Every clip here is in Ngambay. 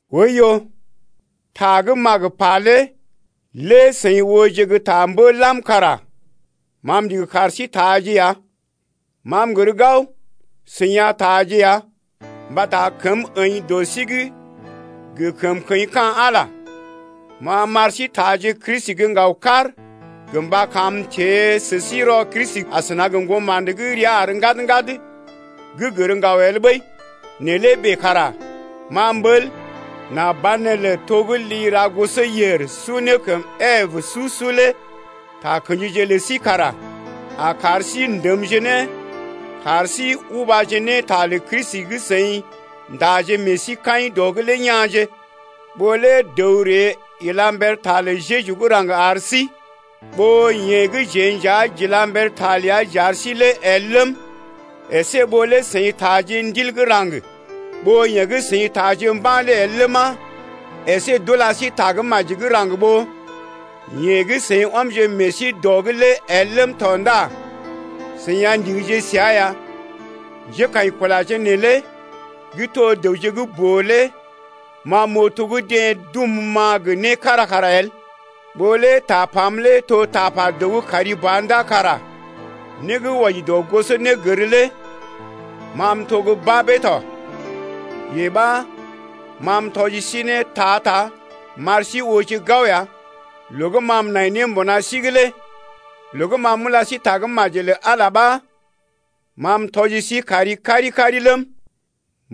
Oiyo, ta gə́ m’a gə pa lé lé seḭ ooje gə́ ta mbə lam kara ma m’ndigi kar sí taaje ya. Ma m’gər gao seḭ a taaje ya. Mbata kəm əḭ dɔ sí’g gə kəmkəḭ ka̰ Ala. Ma m’ar sí taaje Kristi gə́ ŋgaw-kar gə mba kam m’teḛ sə sí rɔ Kristi asəna gə ŋgoma̰də gə́ rəa àr ŋgad-ŋgad gə́ gər ŋgaw el ɓəi. Nɛ lé bèe kara ma m’ɓəl nà banelə to gə́ li ra gosɔyèr su ne kəm Ebe su-su lé takə̰jije lə sí kara a kar sí ndəmje ne kar sí ubaje ne ta lə Kristi gə́ seḭ ndaje meḛ sí kaḭ dəa’g lé kya̰je. Ɓó lé dəw ree ila mber ta lə Jeju gə́ raŋg ar sí ɓó yeḛ gə́ jeḛ nja j’ila mber ta ləa j’ar sí lé el ləm, əsé ɓó lé seḭ taaje Ndil gə́ raŋg ɓó yeḛ gə́ seḭ taaje mba̰ lé el ləma, əsé d’ula sí Tagə́maji gə́ raŋg ɓó yeḛ gə́ seḭ ɔmje meḛ sí dɔ’g lé el ləm tɔ ndá seḭ a ndigije səa ya. Njékaḭkulaje neelé gə́ to dəwje gə́ boo lé ma m’oo to gə́ deḛ dum-ma gə né kára kara el. Ɓó lé tapam lé to tapa dəw gə́ kari ba ndá kara né gə́ wɔji dɔ gosonégər lé ma m’to gə́ babee tɔ, yee ɓa, ma m’tɔji sí ne ta-ta m’ar sí ooje gao ya loo gə́ ma m’nai ne mbuna sí’g lé. Loo gə́ ma m’ula sí Tagə́maji lə Ala ɓa ma m’tɔji sí kari kari-kari ləm,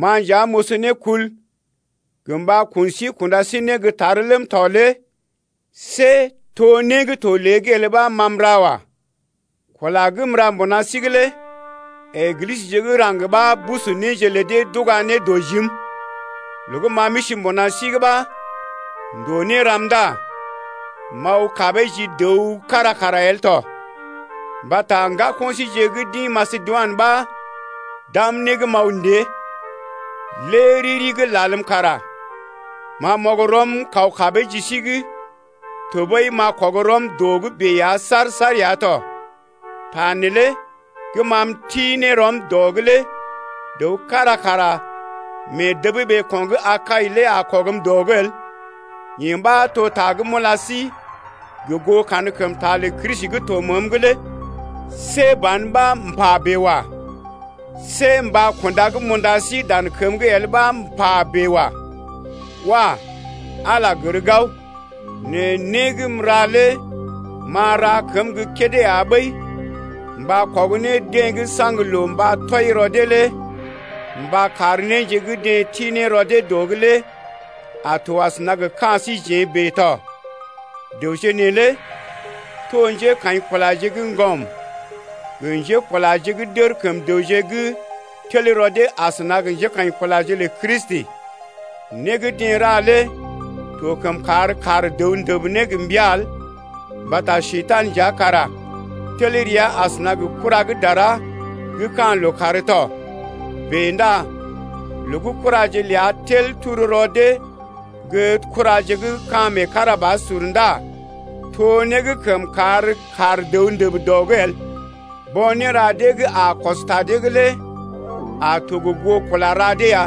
ma nja m’oso ne kul gə mba kun sí kunda sí ne gə́ tar ləm tɔ lé see to né gə́ to lée’g el ɓa ma m’ra wa. Kula gə́ m’ra mbuna sí’g lé Eglisəje gə́ raŋg ɓa busu néje lə dee d’uga ne dɔ jim. Loo gə́ ma m’isi mbuna sí’g ɓa ndòo né ram ndá m’aw kabee ji dəw kára kara el tɔ, mbata ŋgako̰ síje gə́ d’ḭ Masedoinə ɓa d’am né gə́ m’aw ndée. Lé riri gə́ lalm kara ma m’ɔg rɔm kaw kabee ji sí’g tɔɓəi m’a kɔg rɔm dɔ’g bèe ya saar-saar ya tɔ. Ta neelé gə́ ma m’ti ne rɔm dɔ’g lé dəw kára kara mee dəb ɓeeko̰ gə́ Akai lé a kɔgm dɔ’g el, yee ɓa to ta gə́ m’ula sí gə goo kankəmta lə Kristi gə́ to məəm’g lé. See ban ɓa m’pa bèe wa. See mba kunda gə́ m’unda sí dan kəm’g el ɓa m’pa ne bèe wa. Wah! Ala gər gao! Nɛ né gə́ m’ra lé m’a ra kəm gə́ kédé ya ɓəi mba kɔg ne deḛ gə́ saŋg loo mba tɔi rɔ dee lé mba kar néje gə́ deḛ ti ne rɔ dee dɔ’g lé a to asəna gə ka̰ síjeḛ bèe tɔ. Dəwje neelé to njékaḭkulaje gə́ ŋgɔm gə njékulaje gə́ d’ər kəm dəwje gə́ tel rɔ dee asəna gə njékaḭkulaje lə Kristi. Né gə́ deḛ ra lé to kəm kar dəw ndəb ne gə mbəa el mbata Njekurai nja kara tel rəa asəna gə kura gə́ dara gə́ ka̰ lookàr tɔ. Bèe ndá loo gə́ kuraje ləa tel turu rɔ dee gə́ kuraje gə́ ka̰ meekarabasur ndá to né gə́ kəm kaar dəw ndəb dɔ’g el. Bo̰ néra dee gə́ a kɔs ta dee’g lé a to gə goo kula ra dee ya.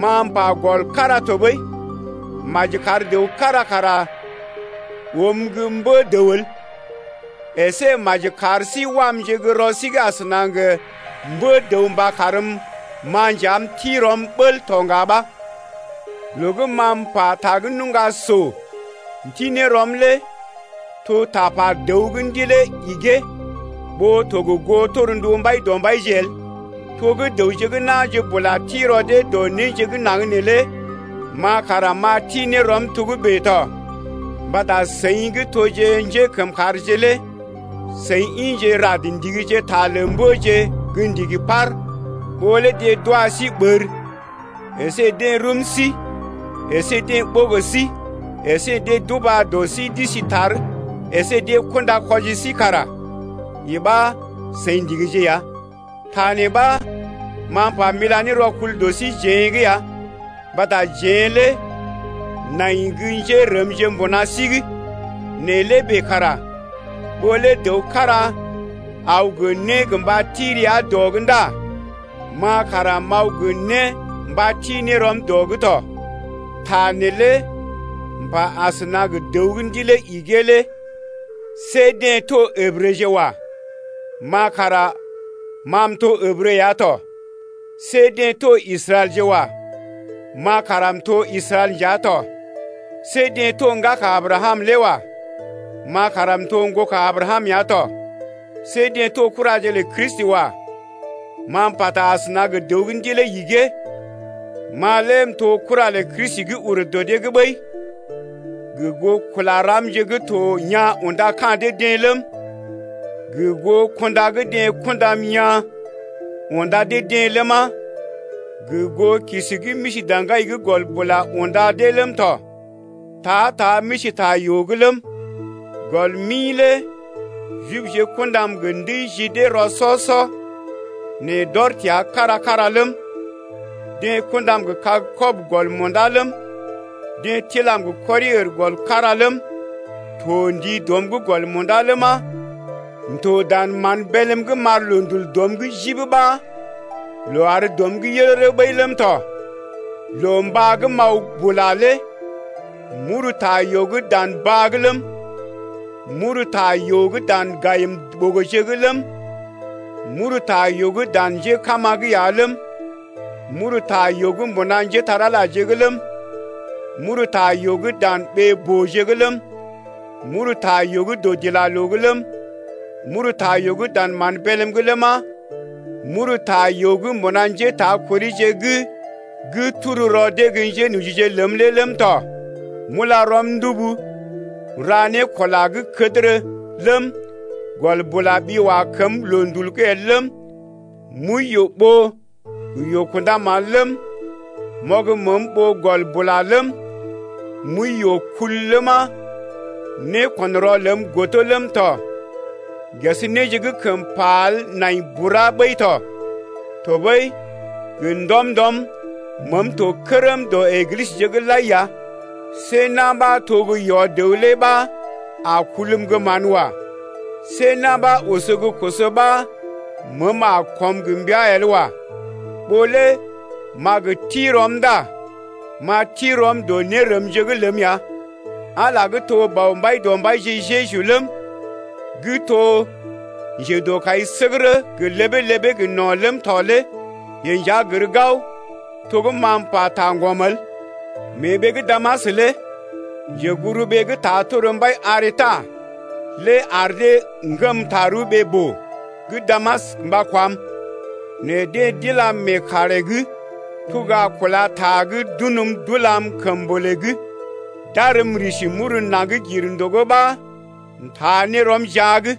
Ma m’pa gɔl kára tɔɓəi, maji kar dəw kára kara oom gə́ mbə-dəw el. Esé maji kar sí wamje gə́ rɔ sí’g asəna gə mbə-dəw mba karm-ma nja m’ti rɔm bəl tɔ ŋga ɓa. Loo gə́ ma m’pata gə́ nuŋga so m’ti ne rɔm lé to tapa dəw gə́ ndilee igee ɓó to gə goo torndu Mbaidɔmbaije el. To gə́ dəwje gə́ na̰je bula ti rɔ dee dɔ néje gə́ naŋg neelé ma kara m’a ti ne rɔm togə́bè tɔ. Mbata seḭ gə́ toje njékəmkàrje lé seḭ ḭje rad ndigije ta lə mbəje gə́ ndigi par. Ɓó lé deḛ d’wa sí ɓər əsé deḛ rum sí əsé deḛ ɓogo sí əsé deḛ d’uba dɔ sí d’isi tar əsé deḛ kunda kwɔji sí kara yee ɓa seḭ ndigije ya. Ta nee ɓa ma m’pa m’ila ne rɔkul dɔ síjeḛ’g ya mbata jeḛ lé nai gə́ njérəmje mbuna sí’g. Nɛ lé bèe kara ɓó lé dəw kára aw gə né gə mba ti rəa dɔ’g ndá ma kara m’aw gə né mba ti ne rɔm dɔ’g tɔ. (Ta neelé m’pa asəna gə dəw gə́ ndilee igee lé tɔ). See deḛ to Ǝbrəje wa. Ma kara ma m’to Ǝbrə ya tɔ. See deḛ to Israɛlje wa. Ma kara m’to Israɛl nja tɔ. See deḛ to ŋgaka Abrakam lé wa. Ma kara m’to ŋgoka Abrakam ya tɔ. See deḛ to kuraje lə Kristi wa. (Ma m’pata asəna gə dəw gə́ ndilee igee.) Ma lé m’to kura lə Kristi gə́ ur dɔ ɓəi gə goo kula ramje gə́ to yaa̰ unda ka̰ dee-deḛ ləm, gə goo kunda gə́ deḛ kundam yaa̰ unda dee-deḛ ləma, gə goo kisi gə́ m’isi daŋgai’g gɔl bula unda dee ləm tɔ. Ta-ta m’isi ta yoo’g ləm 4gɔl mi lé Jibje kundam gə ndəi ji dee rɔ-sɔ-sɔ, nɛ d’ɔr təa kára-kára ləm 5deḛ kundam gə kag kɔb-kɔb gɔl munda ləm, deḛ tilam gə kɔri-ər gɔl kára ləm, to ndii dɔm’g gɔl munda ləma, m’to dan mán bélm’g m’ar loondul dɔm’g jib ɓa loo àr dɔm’g yərərə ɓəi ləm tɔ. Loo mbá gə́ m’aw bula lé m’uru ta yoo’g dan baa’g ləm, m’uru ta yoo’g dan gayim-ɓogoje’g ləm, m’uru ta yoo’g dan njékama’g ya ləm, m’uru ta yoo’g mbuna njépole-magəje’g ləm, m’uru ta yoo’g dan ɓee-booje’g ləm, m’uru ta yoo’g dɔdilaloo’g ləm, m’uru ta yoo’g dan mán bélm’g ləma, m’uru ta yoo’g mbuna njétakorije’g gə́ turu rɔ dee gə́ njénojije ləm lé ləm tɔ. M’ula rɔm ndubu m’ra ne kula gə́ kədərə ləm, gɔl bula ɓi wa kəm loondul’g el ləm, m’wəi yoo-ɓoo gə yoo-kunda-mán ləm, m’ɔg məəm ɓoo gɔl bula ləm, m’wəi yoo-kul ləma, nékɔn-rɔ ləm godo ləm tɔ. Ges néje gə́ kəm pa el nai bura ɓəi tɔ. Tɔɓəi gə ndɔm-ndɔm məəm to kərm dɔ Eglisəje’g lai ya. See na̰ ɓa to gə́ yɔ-dəw lé ɓa a kulm gə́ mán wa. See na̰ ɓa oso gə́ koso ɓa məəm a ko̰m gə mbəa el wa. Ɓó lé m’a gə ti rɔm ndá m’a ti rɔm dɔ nérəmje’g ləm ya. Ala gə́ to Bɔ Mbaidɔmbaije Jeju ləm, gə́ to njedɔkaisəgərə gə ləbee-ləbee gə no̰ ləm tɔ lé yeḛ nja gər gao to gə́ ma m’pata ŋgɔm el. Mee ɓee gə́ Damas lé njeguburuɓee gə́ ta tor mbai Aretas lé ar dee ŋgəm tarəw ɓee-boo gə́ Damas mba kwam. Nɛ deḛ d’ilam mee karè’g tuga kúla ta’g d’unm d’ulam kəmbolè’g d’arm m’risi m’uru naŋg gir ndògo ɓa m’taa ne rɔm jia’g.